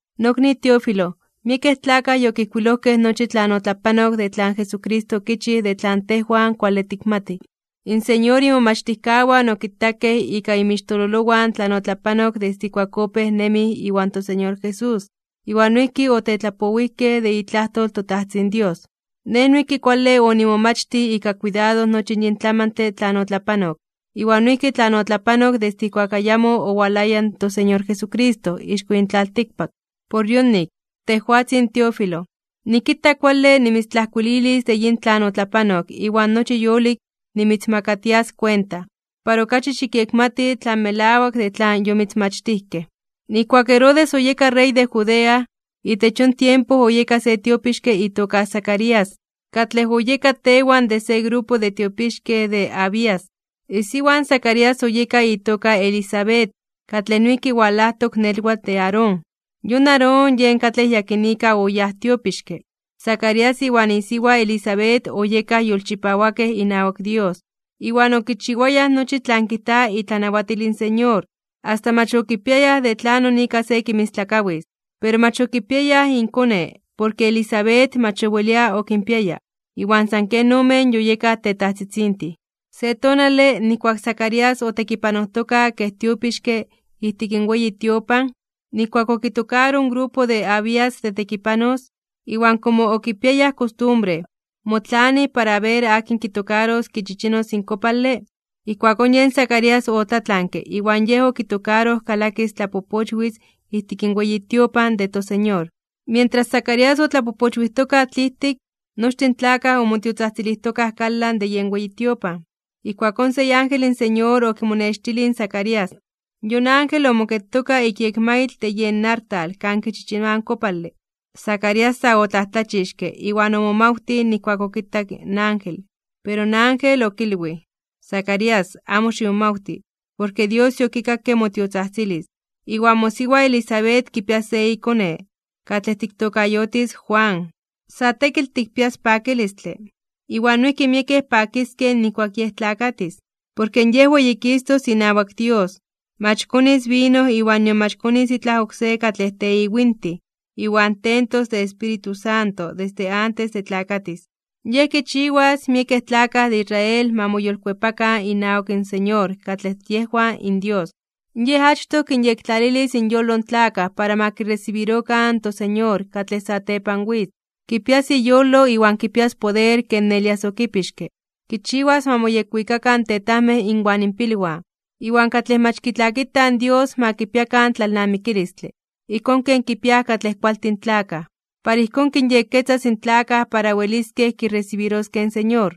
Nokni Teófilo, miekej tlakaj yokijkuilojkej nochi tlan otlapanok de tlan Jesucristo okichij de tlan tejwan kuale tikmatij. In Señor imomachtijkawan okitakej ika inmixtololowan tlan otlapanok desde ijkuak opéj nemij iwan toSeñor Jesús, iwan noijki otetlapowijkej de itlajtol in toTajtzin Dios. Nej noijki kuale onimomachtij ika kuidado nochi yin tlamantle tlan otlapanok, iwan noijki tlan otlapanok desde ijkuak ayamo owalaya in toSeñor Jesucristo ixko yin tlaltikpak. Por yonik, tejwatzin Teófilo, nikita kuale nimitztlajkuililis de yin tlan otlapanok iwan nochi yolik nimitzmakatias kuenta, para okachi xikyekmati tlan melawak de tlan yomitzmachtijkej. Nijkuak Herodes oyeka rey de Judea, itech yon tiempo oyeka se tiopixke itoka Zacarías, katlej oyeka tewan de se grupo de tiopixkej de Abías. Isiwa in Zacarías oyeka itoka Elisabet, katlej noijki walajtok nelwatl de Aarón. Yon Aarón yen katlej yakinika oyáj tiopixke. Zacarías iwan isiwa Elisabet oyekaj yolchipawakej inawak Dios, iwan okichiwayaj nochi tlan kijta itlanawatil in Señor, asta mach okipiayaj de tlanon ika se kinmistlakawis. Pero mach okipiayaj inkone, porke Elisabet mach owelia okinpiaya, iwan san ken omen yoyekaj tetajtzitzintin. Se tonale, nijkuak Zacarías otekipanojtoka kej tiopixke ijtik in weyi tiopan, nijkuak okitokaroj in grupo de Abías de tekipanos, iwan komo okipiayaj kostumbre, motlanij para aber akin kitokaros kichichinos in kopale, ijkuakón yen Zacarías otlatlanke iwan yej okitokaroj kalakis tlapopochwis ijtik in weyi tiopan de toSeñor. Mientras Zacarías otlapopochwijtoka tlijtik, nochtin in tlakaj omotiotzajtzilijtokaj kalan de yen weyi tiopan. Ijkuakón se iángel in Señor okimonextilij in Zacarías. Yon ángel omoketoka ik yekmaitl de yen artal kan kichichinoaj in kopale. Zacarías sa otlajtlachixke (omomajmawtij) iwan omomajmawtij nijkuak okitak in ángel. Pero in ángel okilwij: ―Zacarías, amo ximomawti, porke Dios yokikakke motiotzajtzilis, iwan mosiwa Elisabet kipias se ikone, katlej tiktokayotis Juan. Sa tekitl tikpias pakilistle, iwan noijki miekej pakiskej nijkuak yej tlakatis. Porke yej weyikistos inawak Dios. Mach konis vino iwan nion mach konis itlaj oksé katlej teiwintij, iwan tentos de Espíritu Santo desde antes de tlakatis. Yej kichiwas miekej tlakaj de Israel ma moyolkuepakan inawak in Señor katlej yejwan inDios. Yej achtoj kinyektlalilis inyolo in tlakaj para ma kiresibirokan in toSeñor katlej satepan witz. Kipias iyolo iwan kipias poder ken Elías okipixke. Kichiwas ma moyekwikakan in tetajmej inwan inpilwan, iwan katlej mach kitlakitaj Dios ma kipiakan tlalnamikilistle, ijkón ken kipiaj katlej kualtin tlakaj. Para ijkón kinyekketzas in tlakaj para weliskej kiresibiroskej in Señor.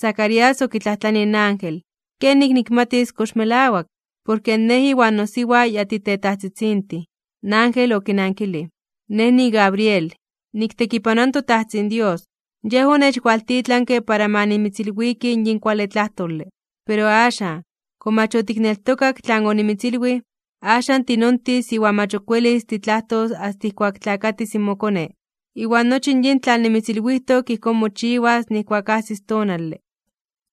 Zacarías okitlajtlanij in ángel: ―¿Kenik nikmatis kox melawak? Porke nej iwan nosiwa ya titetajtzitzintin. In ángel okinankilij: ―Nej niGabriel, niktekipanoa in toTajtzin Dios. Yej onechwaltitlanke para ma nimitzilwiki yin kuale tlajtole. Pero axan, komo mach otikneltokak tlan onimitzilwij, axan tinontis iwan mach ok welis titlajtos asta ijkuak tlakatis in mokone. Iwan nochi yin tlan nimitzilwijtok ijkón mochiwas nijkuak ajsis tonale.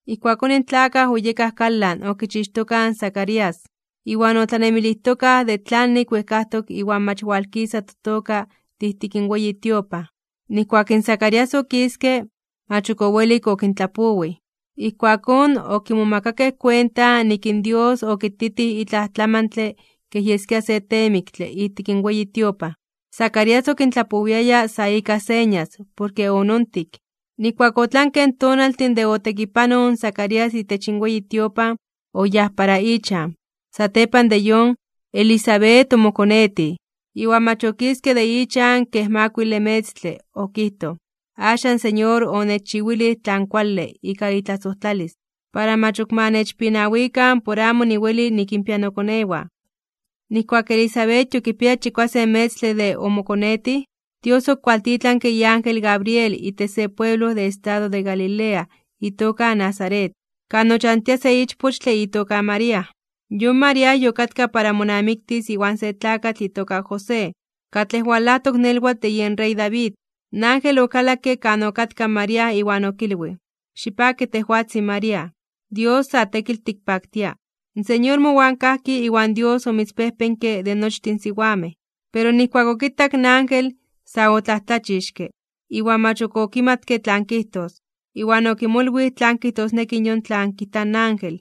Ijkuakón in tlakaj oyekaj kalan okichixtokaj in Zacarías, iwan otlanemilijtokaj de tlanik wejkajtok iwan mach walkisa totoka de ijtik in weyi tiopan. Nijkuak in Zacarías okiske, mach ok owelik okintlapowij. Ijkuakón okimomakakej kuenta nik in Dios okititij itlaj tlamantle kej yeskia se teemiktle ijtik in weyi tiopan. Zacarías okintlapowiaya sa ika señas, porke onontik. Nijkuak otlankej in tonaltin de otekipanoj in Zacarías itech in weyi tiopan, oyáj para ichan. Satepan de yon, Elisabet omokonetij, iwan mach okiske de ichan kej makuile metztle, okijtoj: “Axan in Señor onechchiwilij tlan kuale ika itlasojtlalis, para mach ok ma nechpinawikan por amo niweli nikinpia nokonewan.” Nijkuak Elisabet yokipiaya chikuasen metztle de omokonetij, Dios okualtitlanke iángel Gabriel itech se pueblo de estado de Galilea itoka Nazaret, kan ochantia se ichpochtle itoka María. Yon María yokatka para monamiktis iwan se tlakatl itoka José, katlej walajtok nelwatl de yen rey David. In ángel okalakke kan okatka in María iwan okilwij: ―Xipaki tejwatzin María. Dios sa tekitl tikpaktia. In Señor mowan kajki iwan Dios omitzpejpenke de nochtin siwamej. Pero nijkuak okitak in ángel, sa otlajtlachixke (omomajmawtij) iwan mach ok okimatke tlan kijtos, iwan okimolwij tlan kijtosneki yon tlan kijta in ángel.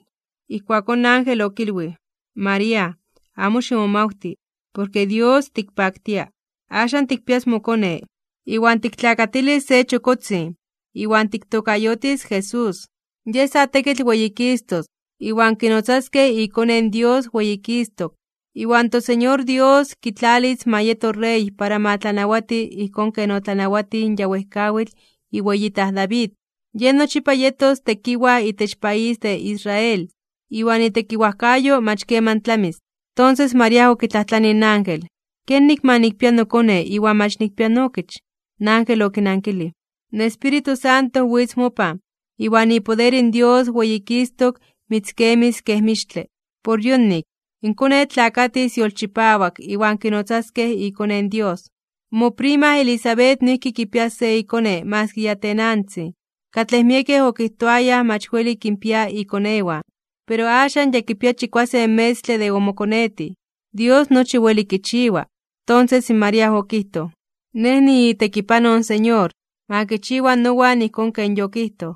Ijkuakón in ángel okilwij: ―María, amo ximomawti, porke Dios tikpaktia. Axan tikpias mokone, iwan tiktlakatilis se chokotzin, iwan tiktokayotis Jesús. Yej sa tekitl weyikistos (weyititos), iwan kinotzaskej iKone in Dios weyikistok, iwan toSeñor Dios kitlalis ma yeto Rey para ma tlanawati ijkón ken otlanawatij in ya wejkawitl iweyitaj David, Yej nochipa yetos tekiwaj itech país de Israel, iwan itekiwajkayo mach keman tlamis. Tonses María okitlajtlanij in ángel: ―¿Kenik ma nikpia nokone iwan mach nikpia nookich? In ángel okinankilij: ―In Espíritu Santo witz mopan, iwan ipoder in Dios weyikistok (weyititok) mitzkemis kej mixtle. Por yonik, in konetl tlakatis yolchipawak iwan kinotzaskej iKone in Dios. Moprima Elisabet noijki kipias se iKone maski ya tenantzin, katlej miekej okijtoayaj mach weli kinpia ikonewan, pero axan ya kipia chikuasen metztle de omokonetij. Dios nochi weli kichiwa. Tonses in María okijtoj: ―Nej niitekipanoj in Señor. Ma kichiwa nowan ijkón ken yotikijtoj.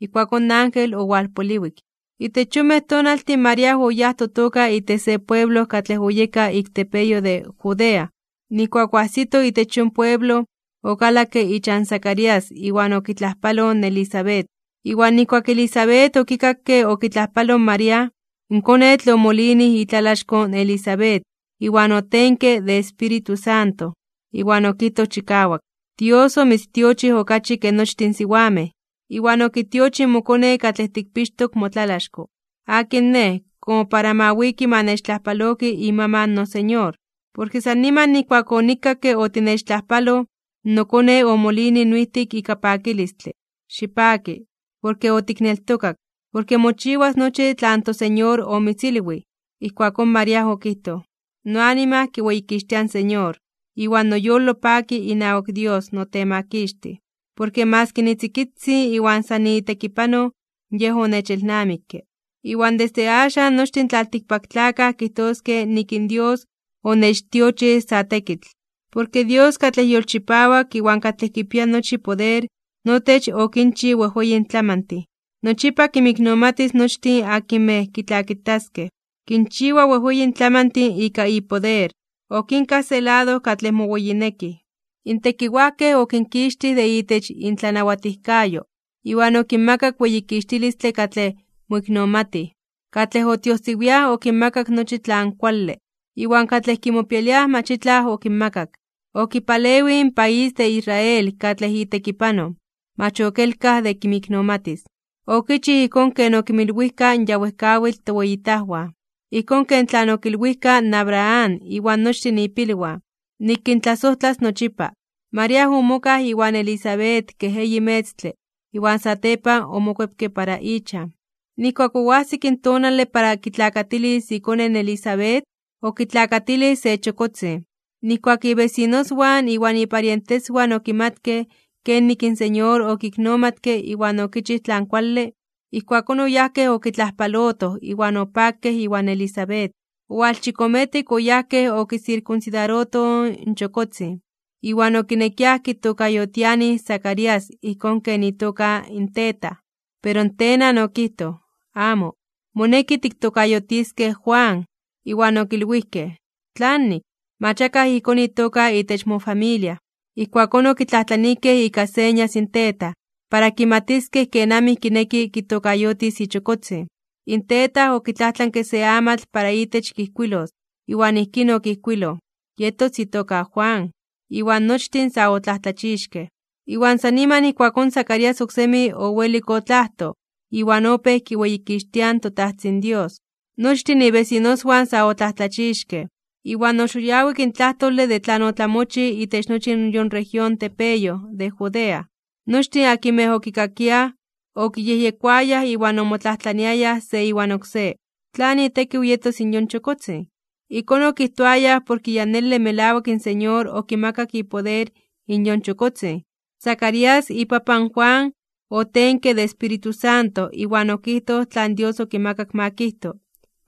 Ijkuakón in ángel owalpoliwik. Itech yonmej tonaltin María oyáj totoka itech se pueblo katlej oyeka ik tepeyoj de Judea. Nijkuak oajsito itech yon pueblo, okalakke ichan Zacarías iwan okitlajpaloj in Elisabet. Iwan nijkuak Elisabet okikakke okitlajpaloj in María, in konetl omolinij itlalaxko in Elisabet, iwan otenke de Espíritu Santo. Iwan okijtoj chikawak: ―Dios omitztiochij okachi ke nochtin in siwamej, iwan okitiochij mokone katlej tikpixtok motlalaxko. ¿Akin nej, komo para ma wiki ma nechtlajpaloki imaman in noSeñor? Porke san niman nijkuak onikakke otinechtlajpaloj, nokone omolinij noijtik ika pakilistle. Xipaki, porke otikneltokak, porke mochiwas nochi tlan toSeñor omitzilwij. Ijkuakón María okijtoj: Noanima kiweyikixtia in Señor, iwan noyolo paki inawak Dios noTemakixtij. Porke maski nitzikitzin iwan san niitekipanoj, Yej onechelnamikke, iwan desde axan nochtin in tlaltikpaktlakaj kijtoskej nik in Dios onechtiochij sa tekitl. Porke Dios katlej yolchipawak iwan katlej kipia nochi poder notech okinchij wejweyin tlamantin. Nochipa kinmiknomatis nochtin akinmej kitlakitaskej. Kinchiwa wejweyin tlamantin ika ipoder. Okinkaj se lado katlej moweyinekij. In tekiwajkej okinkixtij de itech intlanawatijkayo, iwan okinmakak weyikixtilistle katlej moiknomatij. Katlej otiojsiwiaj okinmakak nochi tlan kuale, iwan katlej kimopialiaj mach itlaj okinmakak. Okipalewij in país de Israel katlej itekipanoj, mach okelkaj de kinmiknomatis, okichij ijkón ken okinmilwijka in ya wejkawitl toweyitajwan, ijkón ken tlan okilwijka in Abraham iwan nochtin ipilwan, nik kintlasojtlas nochipa. María omokaj iwan Elisabet kej eyi metztle, iwan satepan omokuepke para ichan. Nijkuak oajsik tonale para kitlakatilis ikone in Elisabet, okitlakatilij se chokotzin. Nijkuak ibesinoswan iwan iparienteswan okimatkej kenik in Señor okiknomatke iwan okichij tlan kuale, ijkuakón oyajkej okitlajpalotoj iwan opakej iwan Elisabet. Owalchikometik oyajkej okisirkunsidarotoj in chokotzin, iwan okinekiaj kitokayotianij Zacarías ijkón ken itoka in tetaj. Pero in tenan okijtoj: ―Amo. Moneki tiktokayotiskej Juan. Iwan okilwijkej: ―¿Tlanik? Mach akaj ijkón itoka itech mofamilia. Ijkuakón okitlajtlanijkej ika señas in tetaj, para kimatiskej kenamij kineki kitokayotis ichokotzin. In tetaj okitlajtlanke se amatl para itech kijkuilos, iwan ijkín okijkuiloj: “Yetos itoka Juan.” Iwan nochtin sa otlajtlachixkej (omomajmawtijkej). Iwan san niman ijkuakón Zacarías oksemi owelik otlajtoj, iwan opéj kiweyikixtia in toTajtzin Dios. Nochtin ibesinoswan sa otlajtlachixkej. Iwan oxoyawik (oxitinki) in tlajtole de tlan otlamochij itech nochi in yon región tepeyoj de Judea. Nochtin akinmej okikakiaj, okiyejyekoayaj iwan omotlajtlaniayaj se iwan oksé: ―¿Tlan itekiw yetos in yon chokotzin? Ijkón okijtoayaj porke ya nele melawak in Señor okimakak ipoder in yon chokotzin. Zacarías, ipapan Juan, otenke de Espíritu Santo iwan okijtoj tlan Dios okimakak ma kijto.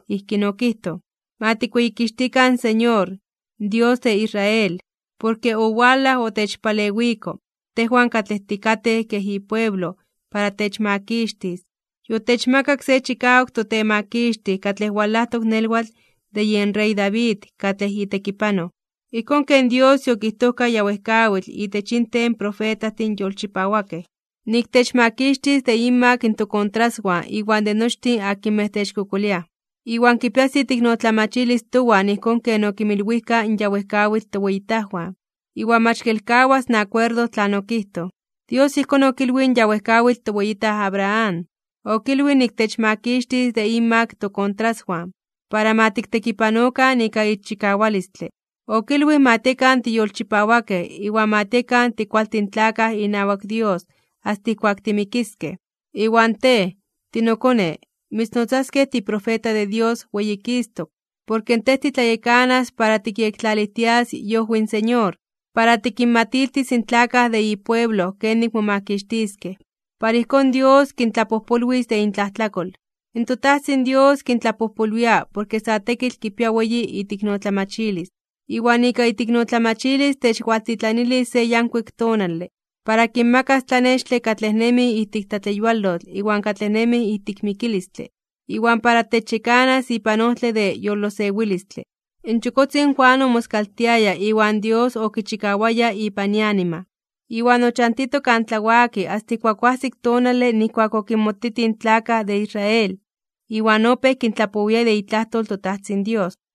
Ijkín okijtoj: Ma tikweyikixtikan in Señor, Dios de Israel, porke owalaj otechpalewiko, tejwan katlej tikatej kej ipueblo para techmakixtis. Yotechmakak se chikawak toTemakixtij katlej walajtok nelwatl de yen rey David katlej itekipanoj. Ijkón ken Dios yokijtojka ya wejkawitl itech inten in profetajtin yolchipawakej. Nik techmakixtis de inmak tokontraswan iwan de nochtin akinmej techkokoliaj. Iwan kipias iteiknotlamachilis towan ijkón ken okinmilwijka in ya wejkawitl toweyitajwan, iwan mach kelkawas in akuerdo tlan okijtoj. Dios ijkón okilwij in ya wejkawitl toweyitaj Abraham. Okilwij nik techmakixtis de inmak tokontraswan, para ma tiktekipanokan ika ixchikawalistle. Okilwij ma tiekan tiyolchipawakej iwan ma tiekan tikualtin tlakaj inawak Dios asta ijkuak timikiskej. Iwan tej, tinokone, mitznotzaskej tiprofeta de Dios weyikistok (weyititok), porke tej titlayekanas para tikyektlalijtias iojwi in Señor. Para tikinmatiltis in tlakaj de ipueblo kenik momakixtiskej, para ijkón Dios kintlapojpolwis de intlajtlakol. In toTajtzin Dios kintlapojpolwia porke sa tekitl kipia weyi iteiknotlamachilis. Iwan ika iteiknotlamachilis techwaltitlanilis se yankuik tonale. Para kinmakas tlanextle katlej nemij ijtik tlatleyualotl iwan katlej nemij ijtik mikilistle, iwan para techyekanas ipan ojtle de yolosewilistle. In chokotzin Juan omoskaltiaya iwan Dios okichikawaya ipan ianima, iwan ochantito kan tlawaki asta ijkuak oajsik tonale nijkuak okinmotitij in tlakaj de Israel iwan opéj kintlapowia de itlajtol in toTajtzin Dios.